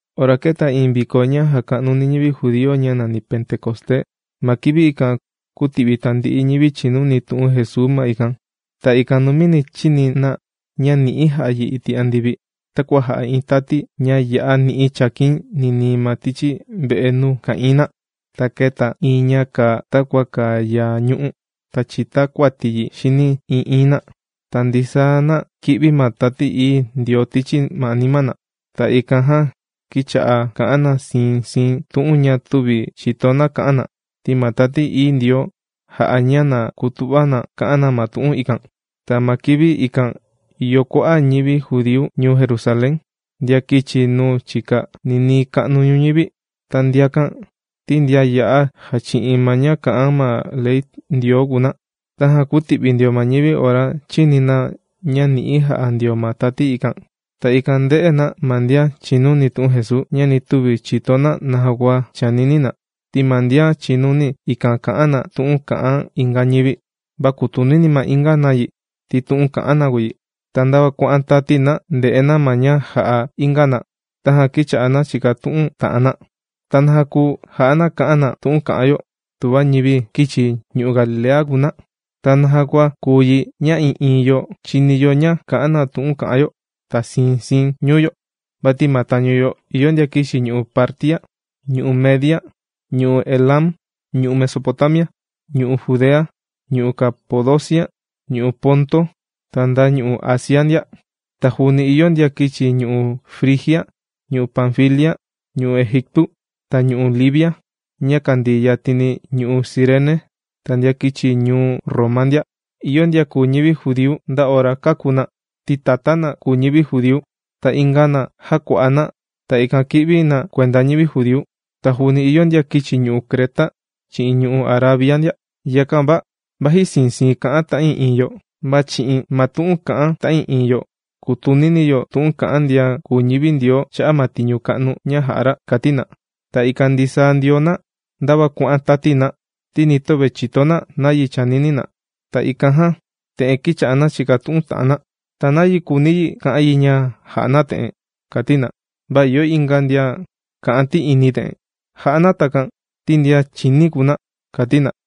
Ora kēta iin viko ña jàka'nu ñivi judíu ña nàni Pentecosté, ma kivi ikan kūti'vi tandi'i ñivi chìnuni tu'un Jesuu ma ikan. Ta ikan numini chīni na ña ni'i jà'a yi iti' andivi, takua jà'a iin tati ña ya'a ni'i chàkin ninii ma tichi ve'e nuu ka'ìin na. Ta kēta iin ña kàa takua kàa yaa ñu'ú, ta chītakuati yi xini ii'iin na. Ta ndisaa na kī'vi ma Tati Ií Ndioo tichi anima na. Ta ikan jan kīcha'a kà'an na siin siin tu'un ña tüvi chìto na kà'an na, ti ma Tati Ií Ndioo jā'a ña na kutu'va na kà'an na ma tu'un ikan. Ta ma kivi ikan ìyo kua'a' ñivi judíu ñuu Jerusalén, ndian kīchi nuu chika, ninii ka'nu ñuñivi. Ta ndiakan ti ndian ya'a jàchi'in ma ña kà'an ma ley Ndioo kùu na. Tajan kūti'vi ndio ma ñivi ora chīni na ña ni'i jà'a ndio ma tati ikan. Ta ikan ndē'e na ma ndian chìnuni tu'un Jesuu, ña ni tüva chìto na naja kua chànini na. Ti ma ndian chìnuni ikan kà'an na tu'un kà'an inga ñivi. Va kùtunini ma inga na yi, ti tu'un kà'an na kùu yi. Ta ndava kuà'an tati na ndè'e na ma ña jà'a inga na. Tajan kīcha'a na chìkatu'un ta'an na: ―¿Ta naja kùu ja'a na kà'an na tu'un kà'an yo tuva ñivi kīchi ñu'u' Galilea kùu na? ¿Ta naja kua kùu yi ña ii'iin yo chìni yo ña kà'an na tu'un kà'an yo, ta siin siin ñuu yo? Vati ma tañu yo ìyo ndian kīchi ñu'u' Partia, ñu'u' Media, ñu'u' Elam, ñu'u' Mesopotamia, ñu'u' Judea, ñu'u' Capadocia, ñu'u' Ponto, ta nda ñu'u' Asia ndia. Ta juuni ìyo ndian kīchi ñu'u' Frigia, ñu'u' Panfilia, ñu'u' Egiptu, ta ñu'u' Libia, ña kàndii yatini ñu'u' Cirene, ta ndian kīchi ñuu Roma ndia. Ìyo ndian kùu ñivi judíu nda ora kāku na, ti tatá na kùu ñivi judíu. Ta inga na, jākua'a na, ta ikan kī'vi na kuenda ñivi judíu. Ta juuni ìyo ndian kīchi ñu'u' Creta chi'in ñu'u' Arabia ndia. Yakan va vaji siin siin kà'an ta'ii'iin yo, va chi'in ma tu'un kà'an ta'ii'iin yo kùtunini yo tu'un kà'an ndian kùu ñivi Ndioo cha'a' ma tiñu ka'nu ña jà'a ra ―kàti na. Ta ikan ndisaa ndio na ndava kuà'an tati na, ti nī töve chìto na nayi chànini na. Ta ikan jan te'en kīcha'a na chìkatu'un ta'an na: ―¿Ta nayi kùuni yi ka'an yi ña jà'a na te'en? ―kàti na. Va ìyo inga ndian kà'an ti'ini te'en: ―Jà'a na takan ti ndian chìní kùu na ―kàti na.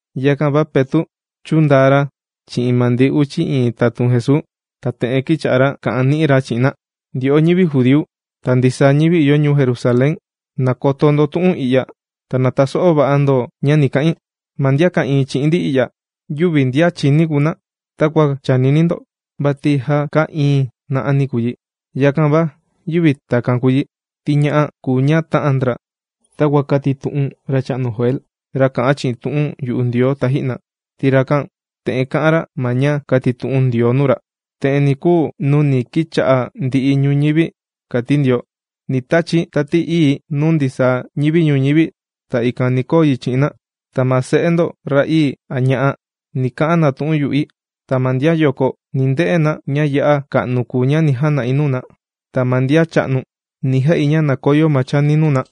Yakan va, Petu' chūndaa ra chi'in ma ndi uchi iin tatun Jesuu, ta te'en kīcha'a ra kà'an ni'i ra chi'in na: ―Ndyo'o ñivi judíu, ta ndisaa ñivi ìyo ñuu Jerusalén, ¡na koto ndo tu'un i'ya, ta na taso'o va'a ndo ña ni ka'in! Ma ndian ka'ìin chi'in ndi i'ya, yüvi ndian chīní kùu na takua chànini ndo, vati já kaa iín na'ani kùu yi. Yakan va yüvi takan kùu yi, ti ña'a kùu ña tà'an ndra takua kātitu'un racha'nu Joel, ra kà'an chi'in tu'un yu'u Ndioo taji'na. Ti rakan te'en kā'an ra ma ña kātitu'un Ndioo nuu ra: Te'en ni kuu nuu ni kicha'a ndi'i ñuñivi, kàti Ndioo. Ni tachi̱ Tati Ii̱ nuu ndisaa ñivi ñuñivi, ta ikan ni koo yi chi'in na. Ta ma se'e ndo, ra'ii a ña'a', ni ka'an na tu'un yu'i. Ta ma ndian yoko, ni nde'e na ña ya'a ka'nu ña ni jana'i nuu na. Ta ma ndian cha'nu, ni ja'i ña na koyo ma chani nuu na.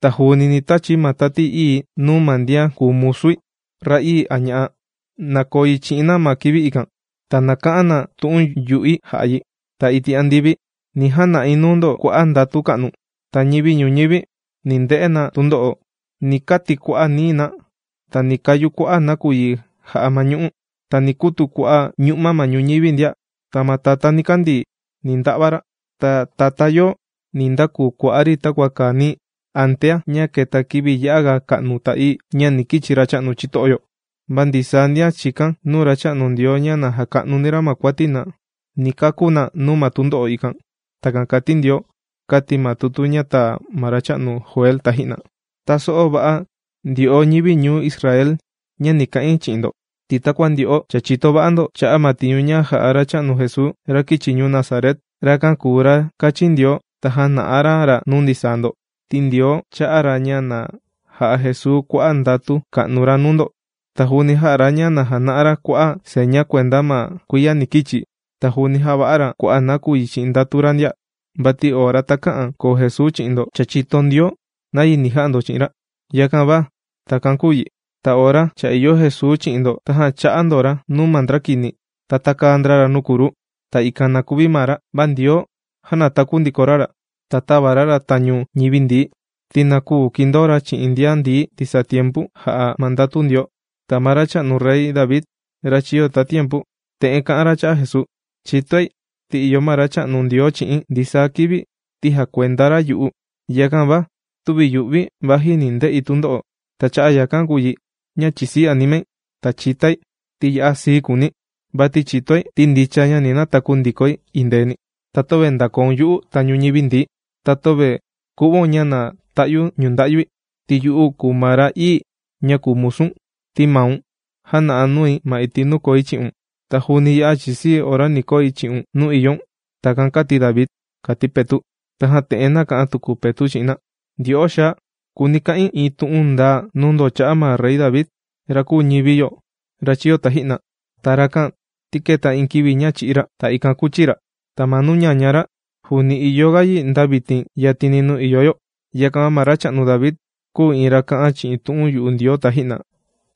Ta juuni ni tachi̱ ma Tati Ii̱ nuu ma ndian kùu musui, ra'ii a ña'a', na koo yi chi'in na ma kivi ikan, ta na ka'an na tu'un yu'i ja'a yi. Ta iti' andivi ni jana'i nuu ndo kua'a' ndatu ka'nu. Ta ñivi ñuñivi ni nde'e na tundo'o. Ni kati' kua'a' nií na, ta ni kayu kua'a' nakuyi jà'a ma ñu'ú. Ta ni kutu kua'a' ñu'ma ma ñuñivi ndia. Ta ma tatá nikandii ni nda'va ra. Ta tatá yoo ni ndakuu kua'á ri takua kàa nií, antea ña keta kivi ya'a ga ka'nu ta ií, ña ni kichi Racha'nu chito'o yo. Va ndisaa ndian chìkan nuu Racha'nu Ndioo ña na jaka'nuni ra ma kuati na, ni kakú na nuu ma tundo'o ikan. Takan kàti Ndioo, kāti ma tutu ña tāa ma racha'nu Joel taji'na. ’¡Taso'o va'a ndo ndyo'o ñivi ñuu Israel ña ni ka'in chi'in ndo! Ti takua ndyo'o cha chìto va'a ndo, cha'a' ma tiñu jā'a Racha'nu Jesuu, ra kīchi ñuu Nazaret. Rakan kùu ra kāchin Ndioo ta jāna'a ra ra nuu ndisaa ndo. Ti Ndioo chā'a ra ña na ja'a Jesuu kua'a' ndatu ka'nu ra nuu ndo, ta juuni jā'a ra ña na jana'a ra kua'a' seña kuenda ma kuiya ni kichi. Ta juuni jāva'a ra kua'a' nakuyi chi'in ndatu ra ndia. Vati ora takä'an koo Jesuu chi'in ndo, cha chìto Ndioo nayi ni ja'a ndo chi'in ra. Yakan va takan kūu yi. Ta ora cha ìyo Jesuu chi'in ndo tajan chā'a ndo ra nuu ma ndra kini, ta tākaa ndra ra nuu kruu, ta ikan na kuvi maa ra. Va Ndioo jānataku ndiko ra ra, ta tāva ra ra tañu ñivi ndií, ti na küu kindoo ra chi'in ndian ndií ndisaa tiempu jà'a ma ndatu Ndioo. Ta ma racha'nu Rey David, ra chīyo tatiempu, te'en kā'an ra cha'a' Jesuu: Chìtoi, ti ìyo ma Racha'nu Ndioo chi'i̱n, ndisaa kivi ti jàkuenda ra yu'u. Yakan va tüvi yu'vi̱ vaji ni nde'i tundo'o. Ta cha'a' yakan kùu yi ña chìsii animai, ta chìtai, ti ya'a sii kùuni̱. Vati chìtoi ti ndicha ña ni nataku ndikoi endeeni. Ta töve ndàkoun yu'u tañu ñivi ndií. Ta töve ku'vaun ña na ta'yu ñunda'yui, ti yu'u kùu ma ra ií ña kùu musu̱n. Ti maun jàna'a nui ma iti' nuu koi chi'un. Ta juuni ya'a chìsii̱ ora ni koi chi'un nuu ìyoun. Takan kāti David ―kàti Petu'. Tajan te'en nàka'an tuku Petu' chi'in na: ―Ndyo'o xaa, kùuni ka'in iin tu'un ndaa nuu ndo cha'a' ma Rey David, ra kūu ñivi yo, ra chīyo taji'na. Ta rakan, ti kēta iin kivi ña chī'í ra. Ta ikan kūchi ra. Ta ma nuu ñaña ra, juuni ìyoga yi nda vitin yatini nuu ìyo yo. Yakan va ma racha'nu David, kūu ra iin ra kā'an chi'in tu'un yu'u Ndioo taji'na.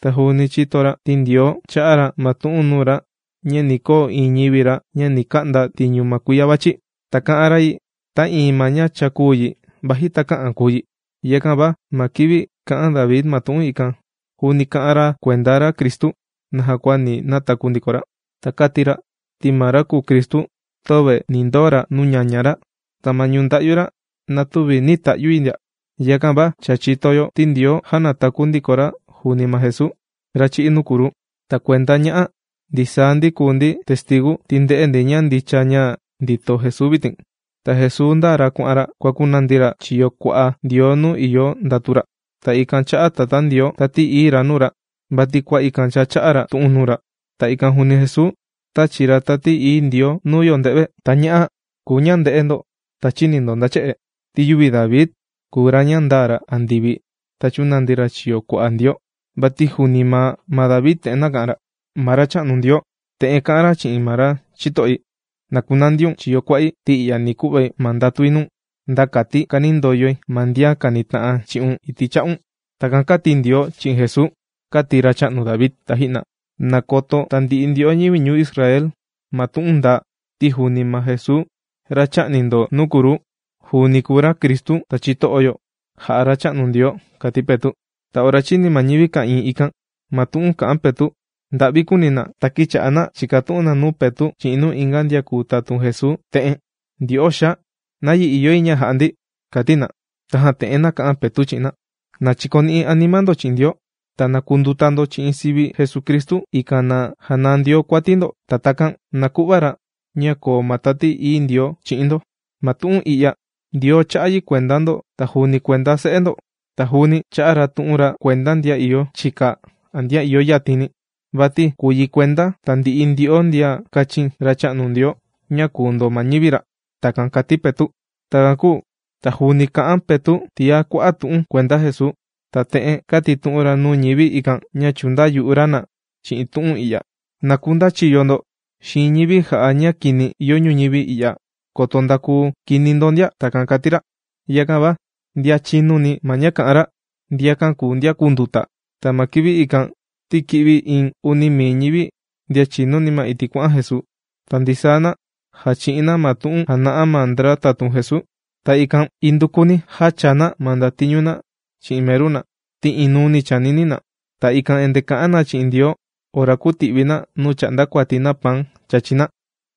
Ta juuni chīto ra ti Ndioo chā'a ra ma tu'un nuu ra ña ni koo iin ñivi ra ña ni ka'nda tiñu ma kuiya vàchi. Ta kā'an ra yi ta iin ma ña chākuu yi, vaji takä'an kuu yi. Yakan va ma kivi kā'an David ma tu'un ikan, juuni kā'an ra kuenda ra Cristu naja kua ni nataku ndiko ra. Ta kāti ra ti ma ra kùu Cristu, töve ni ndoo ra nuu ñaña ra. Ta ma ñunda'yu ra na tüvi nī ta'yu yi ndia. Yakan va cha chìto yo ti Ndioo jānataku ndiko ra juuni ma Jesuu, ra chī'í nuu kruu. Ta kuenda ña'a, ndisaa ndi kùu ndi testigu, ti ndē'e ndi ña ndicha ña ndìto Jesuu vitin. Ta Jesuu ndāa ra kuà'an ra kuàkunandi ra chiyo kua'a Ndioo nuu ìyo ndatu ra. Ta ikan chā'a Tatá Ndioo, Tati Ií ra nuu ra, vati kua ikan cha chā'a ra tu'un nuu ra. Ta ikan juuni Jesuu, tāchi Tati Ií Ndioo nuu yo nde've. Ta ña'a kùu ña ndē'e ndo ta chīni ndo nda che'e. Ti yüvi David kùu ra ña ndāa ra andivi ta chūnandi ra chiyo kua'a Ndioo, vati juuni maa ma David te'en nāka'an ra: Ma Racha'nu Ndioo te'en kā'an ra chi'in ma ra chito'i: “Na kunandiun chiyo kua'i, ti i'ya ni ku'vai ma ndatui nuu̱n, nda kati kanindoyoi ma ndian kànita'an chi'un iti' cha'un.” Takan kāti Ndioo chi'in Jesuu, kāti racha'nu David taji'na. ’Na koto tandi'i ndyo'o ñivi ñuu Israel, ma tu'un ndaa. Ti juuni ma Jesuu ra chā'ni ndo nuu kruu, juuni kùu ra Cristu ta chito'o yo, jà'a Racha'nu Ndioo ―kàti Petu'. Ta ora chīni ma ñivi ka'ìin ikan ma tu'un kà'an Petu', nda'vi kùuni na, ta kīcha'a na chìkatu'un na nuu Petu' chi'in nuu inga ndian kùu tatun Jesuu te'en: ―¡Ndyo'o xaa! ¿Nayi ìyo yi ña jà'a ndi? ―kàti na. Tajan te'en nāka'an Petu' chi'in na: ―¡Na chikoni'i anima ndo chi'in Ndioo! ¡Ta na kunduta ndo chi'in sivi Jesucristu, ikan na janaa Ndioo kuati ndo, ta takan na ku'va ra ña na koo ma Tati Ií Ndioo chi'in ndo! Ma tu'un i'ya Ndioo chā'a yi kuenda ndo ta juuni kuenda se'e ndo. Ta juuni chā'a ra tu'un ra kuenda ndian ìyo chika a ndian ìyo yatini, vati kùu yi kuenda tandi'i ndyo'o ndian kāchin Racha'nu Ndioo ña kuu ndo ma ñivi ra. ―Takan kàti Petu'. Takan kūu ta juuni kà'an Petu' tiá kua'a' tu'un kuenda Jesuu, ta te'en kātitu'un ra nuu ñivi ikan ña chùndayu'u ra na chi'in tu'un i'ya: ―¡Na kundachiyo ndo xiin ñivi jà'a ña kini ìyo ñuñivi i'ya koto ndakuu kini ndo ndia! ―Takan kàti ra. Yakan va ndian chīnuni ma ña kà'an ra, ndiakan kùu ndian kūnduta. Ta ma kivi ikan ti kī'vi iin uni mii ñivi, ndian chìnuni ma iti' kuà'an Jesuu. Ta ndisaa na jàchi'in na ma tu'un jàna'a ma ndra tatun Jesuu. Ta ikan indukuni jāchaa na ma ndatiñu na chi'in meru na, ti inuuni chànini na. Ta ikan endee kà'an na chi'in Ndioo ora kùti'vi na nuu chà'nda kuati na paan chàchi na.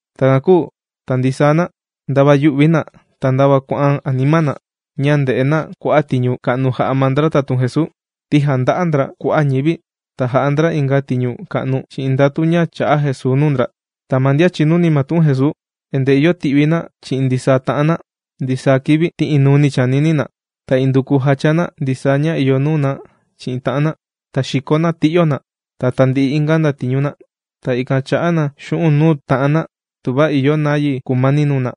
Takan kūu ta ndisaa na, ndava yù'vi na ta ndava kuà'an anima na ña ndè'e na kua'a' tiñu ka'nu jà'a ma ndra tatun Jesuu, ti jànda'a ndra kua'a' ñivi ta jà'a ndra inga tiñu ka'nu chi'in ndatu ña chà'a Jesuu nuu ndra. Ta ma ndian chìnuni ma tu'un Jesuu, endee ìyo ti'vi na chi'in ndisaa ta'an na ndisaa kivi ti inuuni chànini na. Ta induku jàchaa na ndisaa ña ìyo nuu na chi'in ta'an na. Ta xìko na ti'yo na, ta tandi'i inga ndatiñu na. Ta ikan chà'a na xu'un' nuu ta'an na tuva ìyo nayi kùmani nuu na.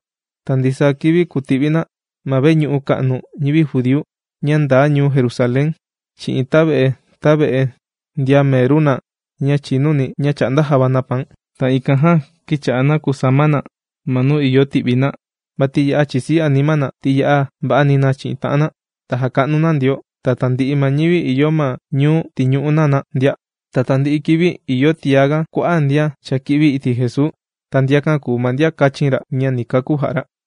Ta ndisaa kivi kùti'vi na ma veñu'u ka'nu ñivi judíu ña ndaa ñuu Jerusalén chi'in tave'e tave'e ndian meru na ña chìnuni, ña chà'nda java na paan. Ta ikan jan kīcha'a na kùsama na ma nuu ìyo ti'vi na, vati ya'a chìsii anima na ti ya'a va'ani na chi'in ta'an na. Ta jàka'nu na Ndioo, ta tandi'i ma ñivi ìyo ma ñuu tìñu'u na na ndia. Ta tandi'i kivi ìyo tiá ga kua'a' ndian cha kī'vi iti' Jesuu, ta ndiakan kùu ma ndian kāchin ra ña ni kakú jà'a ra.